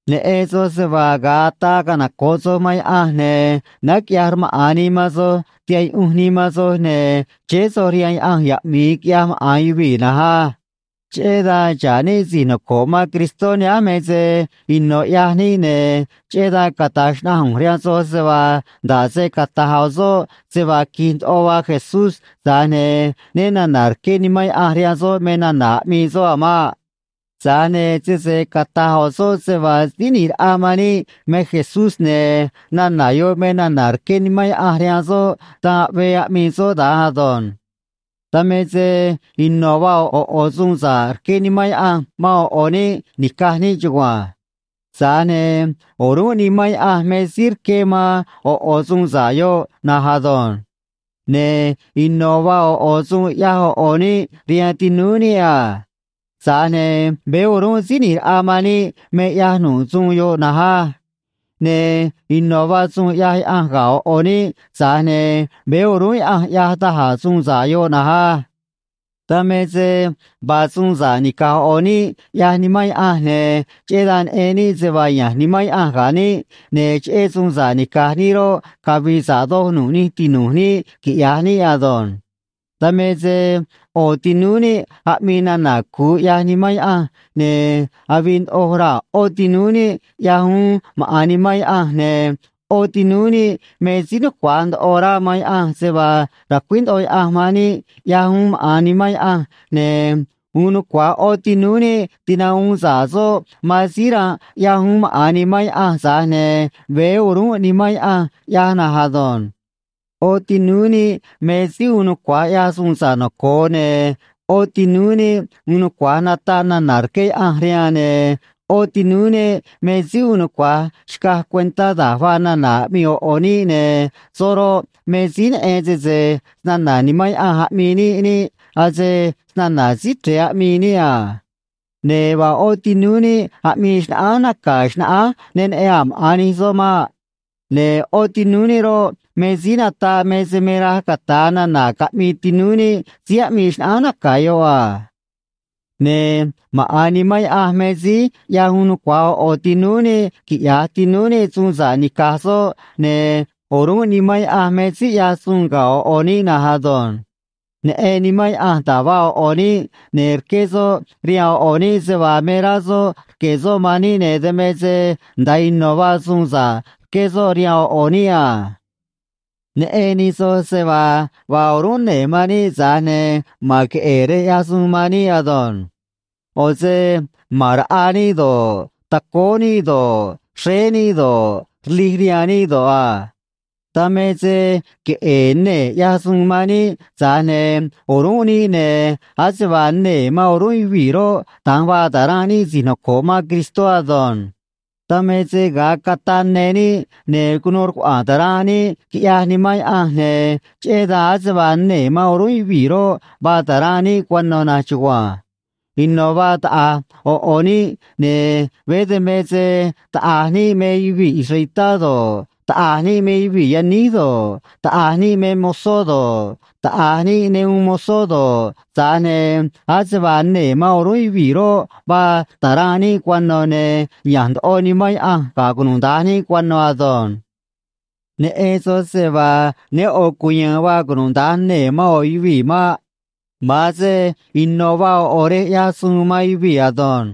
Neꞌen soj se vaa ga̱a ataa canoco̱ꞌ soj man Yaꞌanj, ne̱ náá quiꞌyaj rmaꞌa̱n nii man soj, tihaꞌ yuꞌunj nii man soj, ne̱ chéé soj rihaan yaꞌanj yaꞌmi̱i quiꞌyaj maꞌa̱n yuvii̱ na̱nj á. Cheꞌé dan xa̱ꞌ níꞌ si̱j noco̱ꞌ man Cristó nihánj me se ino̱ ꞌyaj níꞌ, ne̱ cheꞌé dan cata̱j xnaꞌanj ꞌu̱nj rihaan soj se vaa nda̱ꞌ se cata̱j ꞌo̱ soꞌ se vaa qui̱j ndoꞌo vaa Jesús, tza̱j ne̱ né na̱na̱ rqué Nimán Yaꞌanj rihaan soꞌ me nana̱ aꞌmii soꞌ a̱ maꞌ. Tza̱j ne̱ sese cata̱j ꞌo̱ soꞌ se vaa Síí ꞌNi̱j Raꞌa man níꞌ me Jesús, ne̱ nana̱ yoꞌ me nana̱ rqué Nimán Yaꞌanj rihaan soꞌ, dan aꞌvee aꞌmii soꞌ da̱nj ado̱nj. Dan me se ino̱ vaa ꞌo̱ ꞌo̱ suun sa̱ꞌ rqué Nimán Yaꞌanj man ꞌo̱ ꞌo̱ níꞌ nica̱j níꞌ chugua̱nj. Tza̱j ne̱ o̱rúnꞌ Nimán Yaꞌanj me síí rqué man ꞌo̱ ꞌo̱ suun sa̱ꞌ yoꞌ na̱nj ado̱nj. Ne̱ ino̱ vaa ꞌo̱ ꞌo̱ suun ꞌyaj ꞌo̱ ꞌo̱ níꞌ rihaan tinúú níꞌ a. Tza̱j ne̱ veé o̱rúnꞌ Síí ꞌNi̱j Raꞌa man níꞌ me ꞌyaj nu̱ꞌ suun yoꞌ na̱nj á. Ne̱ ino̱ vaa suun ꞌyaj Yaꞌanj ga̱ ꞌo̱ ꞌo̱ níꞌ, tza̱j ne̱ veé o̱rúnꞌ Yaꞌanj ꞌyaj da̱j a̱ suun sa̱ꞌ yoꞌ na̱nj á. Dan me se vaa suun sa̱ꞌ nica̱j ꞌo̱ ꞌo̱ níꞌ, ꞌyaj Nimán Yaꞌanj, ne̱ cheꞌé dan neꞌen níꞌ se vaa ya̱nj Nimán Yaꞌanj ga̱ níꞌ, ne̱ cheꞌé suun sa̱ꞌ nica̱j níꞌ roꞌ, cavi̱i̱ sa̱ꞌ doj nu̱ꞌ nij tinu̱j níꞌ, quiꞌya̱j níꞌ ado̱nj. Dan me se ꞌo̱ tinúú níꞌ aꞌmii nana̱ cu̱u, ꞌyaj Nimán Yaꞌanj, ne̱ avii ndoꞌo raa̱ ꞌó tinúú níꞌ, ꞌyaj uún maꞌa̱n Nimán Yaꞌanj, ne̱ ꞌó tinúú níꞌ me síí nucua̱j ndoꞌo rá man Yaꞌanj se vaa ra̱cuíj ndoꞌo Yaꞌanj man níꞌ, ꞌyaj uún maꞌa̱n Nimán Yaꞌanj, ne̱ uun nucua̱j ꞌó tinúú níꞌ tinahuun sa̱ꞌ soꞌ man síí ranꞌ, ꞌyaj uún maꞌa̱n Nimán Yaꞌanj, tza̱j ne̱ veé o̱rúnꞌ Nimán Yaꞌanj ꞌyaj na̱nj ado̱nj. ꞌÓ tinúú níꞌ me síí uun nucua̱j ꞌyaj suun sa̱ꞌ noco̱o, ne̱ ꞌó tinúú níꞌ uun nucua̱j nataꞌ nana̱ rqué Yaꞌanj rihaan, ne̱ ꞌó tinúú níꞌ me síí uun nucua̱j xcaj cuentá da̱j vaa nana̱ aꞌmii ꞌo̱ ꞌo̱ níꞌ, ne̱ soꞌ roꞌ, me síí neꞌen sese snana̱ Nimán Yaꞌanj aꞌmii níꞌ niꞌ, ase snana̱ Síí Chre̱e aꞌmii níꞌ a. Ne̱ vaa ꞌó tinúú níꞌ aꞌmii xnaꞌánj naca̱ xnaꞌánj ne neꞌen a̱ maꞌa̱n nij soꞌ maꞌ. Ne̱ ꞌó tinúú níꞌ roꞌ, me síí nataꞌ me se me raj cata̱a nana̱ caꞌmii tinúú níꞌ síí aꞌmii xnaꞌánj naca̱ yoꞌ a. Ne̱ maꞌa̱n Nimán Yaꞌanj me síí ꞌyaj uun nucua̱j ꞌo̱ ꞌo̱ tinúú níꞌ quiꞌya̱j tinúú níꞌ suun sa̱ꞌ nica̱j soꞌ, ne̱ o̱rúnꞌ Nimán Yaꞌanj me síí ꞌyaj suun ga̱ ꞌo̱ ꞌo̱ níꞌ na̱nj ado̱nj. Neꞌen Nimán Yaꞌanj da̱j vaa ꞌo̱ ꞌo̱ níꞌ, ne̱ rqué soꞌ rihaan ꞌo̱ ꞌo̱ níꞌ se vaa me rá soꞌ rque̱ soꞌ man níꞌ, ne̱ dan me se nda̱a ino̱ vaa suun sa̱ꞌ rqué soꞌ rihaan ꞌo̱ ꞌo̱ níꞌ a. Neꞌen nij soj se vaa vaa o̱rúnꞌ nee̱ man níꞌ, tza̱j ne̱ ma̱n queꞌe̱e̱ rej ꞌyaj suun man níꞌ ado̱nj. ꞌO̱ se ma̱n raꞌa níꞌ do̱ꞌ, tacóó níꞌ do̱ꞌ, xréé níꞌ do̱ꞌ, rlij rihaan níꞌ do̱ꞌ a. Dan me se queꞌe̱e̱ nee̱ ꞌyaj suun man níꞌ, tza̱j ne̱ o̱rúnꞌ níꞌ, ne̱ ase vaa nee̱ man o̱rúnꞌ yuvii̱ roꞌ, da̱nj vaa ta̱ranꞌ níꞌ si̱j noco̱ꞌ man Cristó ado̱nj. Dan me se ga̱a cataꞌ ne níꞌ, ne̱ cunuu rcuaꞌa̱a̱n ta̱ranꞌ níꞌ, quiꞌyaj Nimán Yaꞌanj, ne̱ cheꞌé dan ase vaa nee̱ man o̱rúnꞌ yuvii̱ roꞌ, vaa ta̱ranꞌ níꞌ cuano̱ na̱nj chugua̱nj. Ino̱ vaa taꞌa̱j ꞌo̱ ꞌo̱ níꞌ, ne̱ veé dan me se taꞌa̱j níꞌ me yuvii̱ israelitá do̱ꞌ, taꞌa̱j níꞌ me yuvii̱ yaníj do̱ꞌ, taꞌa̱j níꞌ me mozó do̱ꞌ, taꞌa̱j níꞌ ne uun mozó do̱ꞌ, tza̱j ne̱ ase vaa nee̱ man o̱rúnꞌ yuvii̱ roꞌ, vaa ta̱ranꞌ níꞌ cuano̱, ne̱ ya̱nj ndoꞌo Nimán Yaꞌanj ga̱ cunuda̱nj níꞌ cuano̱ ado̱nj. Neꞌen soj se vaa ne ꞌo̱ cuya̱a̱n vaa cunuda̱nj nee̱ man ꞌo̱ yuvii̱ maꞌ. Ma̱an se ino̱ vaa ꞌo̱ ꞌo̱ rej ꞌyaj suun man yuvii̱ ado̱nj.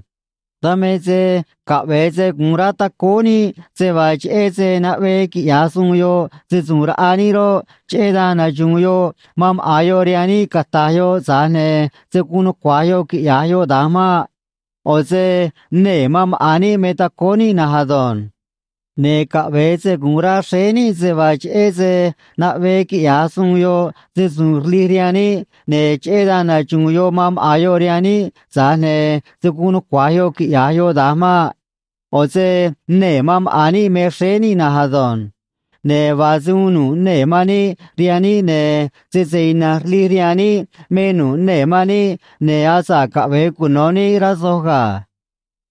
Dan me se caꞌve̱e se gu̱un rá tacóó níꞌ se vaa, cheꞌé se naꞌvee quiꞌya̱j suun yoꞌ se‑su̱u̱n raꞌa níꞌ roꞌ, cheꞌé dan naxu̱u̱n yoꞌ man maꞌa̱n yoꞌ rihaan níꞌ cata̱j yoꞌ, tza̱j ne̱ se̱ guun nucua̱j yoꞌ quiꞌya̱j yoꞌ da̱nj maꞌ. ꞌO̱ se nee̱ man maꞌa̱n níꞌ me tacóó níꞌ na̱nj ado̱nj. Ne̱ caꞌve̱e se gu̱un rá xréé níꞌ se vaa, cheꞌé se naꞌvee quiꞌya̱j suun yoꞌ se‑su̱u̱n rlij rihaan níꞌ, ne̱ cheꞌé dan naxu̱u̱n yoꞌ man maꞌa̱n yoꞌ rihaan níꞌ, tza̱j ne̱ se̱ guun nucua̱j yoꞌ quiꞌya̱j yoꞌ da̱nj maꞌ. ꞌO̱ se nee̱ man maꞌa̱n níꞌ me xréé níꞌ na̱nj ado̱nj. Ne̱ vaa se uun nu̱ꞌ nee̱ man níꞌ rihaan níꞌ, ne̱ sese ina̱nj rlij rihaan níꞌ me nu̱ꞌ nee̱ man níꞌ, ne̱ asa̱ꞌ caꞌve̱e cuno̱ níꞌ, rá soj ga̱.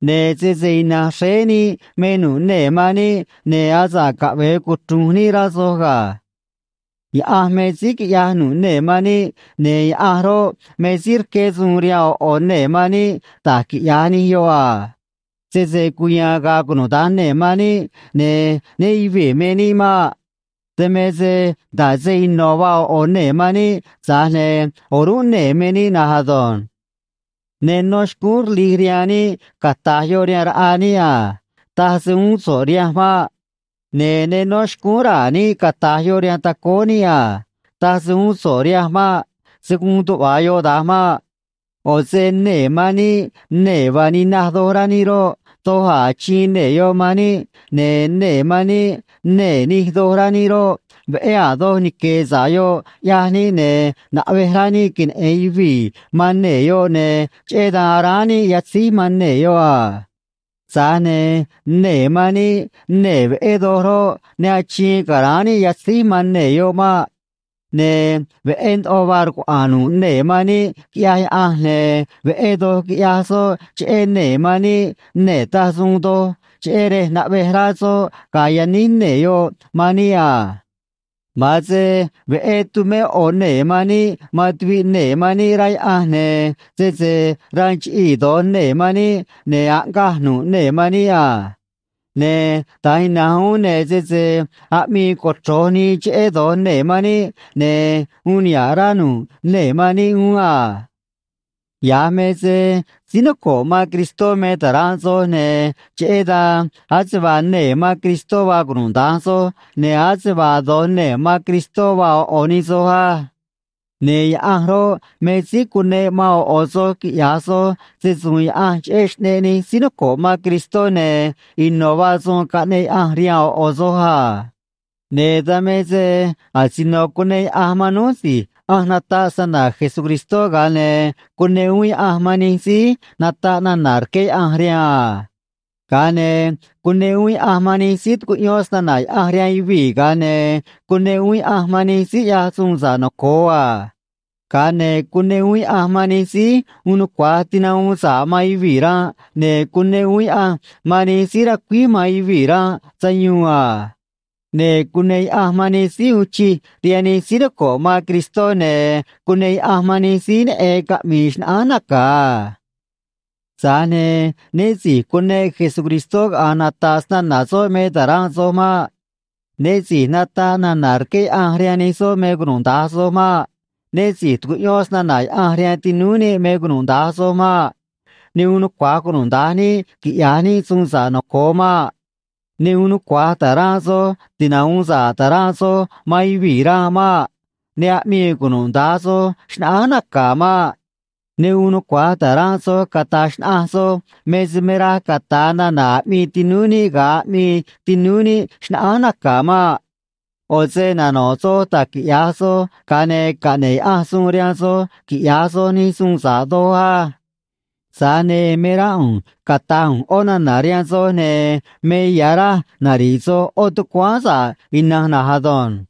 Ne̱ sese ina̱nj xréé níꞌ me nu̱ꞌ nee̱ man níꞌ, ne̱ asa̱ꞌ caꞌve̱e cuchru̱nj níꞌ, rá soj ga̱. Yaꞌanj me síí quiꞌyaj nu̱ꞌ nee̱ man níꞌ, ne̱ Yaꞌanj roꞌ, me síí rqué suun rihaan ꞌo̱ ꞌo̱ nee̱ man níꞌ da̱j quiꞌya̱j nij yoꞌ a. Sese cuya̱a̱n ga̱a̱ cunuda̱nj nee̱ man níꞌ, ne̱ né yuvi̱i̱ me níꞌ maꞌ. Dan me se nda̱ꞌ se ino̱ vaa ꞌo̱ ꞌo̱ nee̱ man níꞌ, tza̱j ne̱ o̱rúnꞌ nee̱ me níꞌ na̱nj ado̱nj. Ne nó xcúún rlij rihaan níꞌ cata̱j yoꞌ rihaan raꞌa níꞌ a: “Taj se uún so̱ꞌ rihanj maꞌ.” Ne̱ ne nó xcúún raa̱ níꞌ cata̱j yoꞌ rihaan tacóó níꞌ a: “Taj se uún so̱ꞌ rihanj maꞌ.” Se̱ guun tuꞌva̱ yoꞌ da̱nj maꞌ. ꞌO̱ se nee̱ man níꞌ nee̱ vaa ninaj doj rá níꞌ roꞌ, doj a̱ achiin nee̱ yoꞌ man níꞌ, ne̱ nee̱ man níꞌ nee̱ nij doj rá níꞌ roꞌ, veꞌé a̱ doj nique̱e̱ sa̱ꞌ yoꞌ, ꞌyaj níꞌ, ne̱ naꞌvej rá níꞌ queneꞌe̱n yuvii̱ man nee̱ yoꞌ, ne̱ cheꞌé dan aráán níꞌ yatzíj man nee̱ yoꞌ a. Tza̱j ne̱ nee̱ man níꞌ nee̱ veꞌé doj roꞌ, ne achiin ca̱ráán níꞌ yatzíj man nee̱ yoꞌ maꞌ. Ne̱ veꞌé ndoꞌo vaa rcuaꞌa̱a̱n nu̱ꞌ nee̱ man níꞌ, quiꞌyaj Yaꞌanj, ne̱ veꞌé doj quiꞌyaj soꞌ cheꞌé nee̱ man níꞌ nee̱ taj suun doj, cheꞌé rej naꞌvej rá soꞌ ga̱a̱ yaníj nee̱ yoꞌ man níꞌ a. Ma̱an se veꞌé tu̱mé ꞌo̱ nee̱ man níꞌ man tuviꞌ nee̱ man níꞌ, rá Yaꞌanj, ne̱ sese ranꞌ chiꞌii̱ do̱j nee̱ man níꞌ, ne̱ aꞌngaj nu̱ꞌ nee̱ man níꞌ a. Ne̱ da̱nj ina̱nj uún, ne̱ sese aꞌmii cochro̱j nii cheꞌé do̱j nee̱ man níꞌ, ne̱ uun niha̱ꞌ rá nu̱ꞌ nee̱ man níꞌ uún a. Ya̱j me se síí noco̱ꞌ man Cristó me ta̱ranꞌ soj, ne̱ cheꞌé dan ase vaa nee̱ man Cristó vaa cunuda̱nj soj, ne̱ ase vaa do̱j nee̱ man Cristó vaa ꞌo̱ ꞌo̱ nij soj á. Ne̱ Yaꞌanj roꞌ, me síí cuneꞌ man ꞌo̱ ꞌo̱ soj quiꞌya̱j soj se‑su̱u̱n Yaꞌanj cheꞌé xꞌneꞌ nij síí noco̱ꞌ man Cristó, ne̱ ino̱ vaa suun caꞌneꞌ Yaꞌanj rihaan ꞌo̱ ꞌo̱ soj a. Ne̱ dan me se asino cuneꞌ Yaꞌanj man núj si̱j ꞌanj nataꞌ snana̱ Jesucristó, ga̱a ne̱ cuneꞌ uún Yaꞌanj man nij síí nataꞌ nana̱ rqué Yaꞌanj rihaan a. Ga̱a ne̱ cuneꞌ uún Yaꞌanj man nij síí tucuꞌyón snana̱ Yaꞌanj rihaan yuvii̱, ga̱a ne̱ cuneꞌ uún Yaꞌanj man nij síí ꞌyaj suun sa̱ꞌ noco̱o a. Ga̱a ne̱ cuneꞌ uún Yaꞌanj man nij síí uun nucua̱j tinahuun sa̱ꞌ man yuvii̱ ranꞌ, ne̱ cuneꞌ uún Yaꞌanj man nij síí racuíj man yuvii̱ ranꞌ sayuun a. Ne̱ cuneꞌ Yaꞌanj man nij síí uun chij rihaan nij síí noco̱ꞌ man Cristó, ne̱ cuneꞌ Yaꞌanj man nij síí neꞌen caꞌmi̱i̱ xnaꞌánj naca̱ a. Tza̱j ne̱ né si̱j cuneꞌ Jesucristó caꞌa̱nj nata̱ꞌ snana̱ soꞌ me ta̱ranꞌ soj maꞌ. Né si̱j nataꞌ nana̱ rqué Yaꞌanj rihaan nij soꞌ me cunuda̱nj soj maꞌ. Né si̱j tucuꞌyón snana̱ Yaꞌanj rihaan tinúú níꞌ me cunuda̱nj soj maꞌ. Ne uun nucua̱j cunuda̱nj níꞌ quiꞌya̱j níꞌ suun sa̱ꞌ noco̱o maꞌ. Ne uun nucua̱j ta̱ranꞌ soj tinahuun sa̱ꞌ ta̱ranꞌ soj man yuvii̱ ranꞌ maꞌ. Ne aꞌmii cunuda̱nj soj xnaꞌánj naca̱ maꞌ. Ne uun nucua̱j ta̱ranꞌ soj cataj xnaꞌanj soj me se me raj cata̱a nana̱ aꞌmii tinúú níꞌ ga̱a aꞌmii tinúú níꞌ xnaꞌánj naca̱ maꞌ. ꞌO̱ se nano̱ꞌ soj da̱j quiꞌya̱j soj, ga̱a ne̱ caꞌne̱ꞌ Yaꞌanj suun rihaan soj quiꞌya̱j soj nij suun sa̱ꞌ doj á. Tza̱j ne̱ me rá ꞌu̱nj cata̱j ꞌu̱nj ꞌó nana̱ rihaan soj, ne̱ me ya̱ raj nari̱ꞌ soj ꞌó tucuáán sa̱ꞌ ina̱nj na̱nj ado̱nj.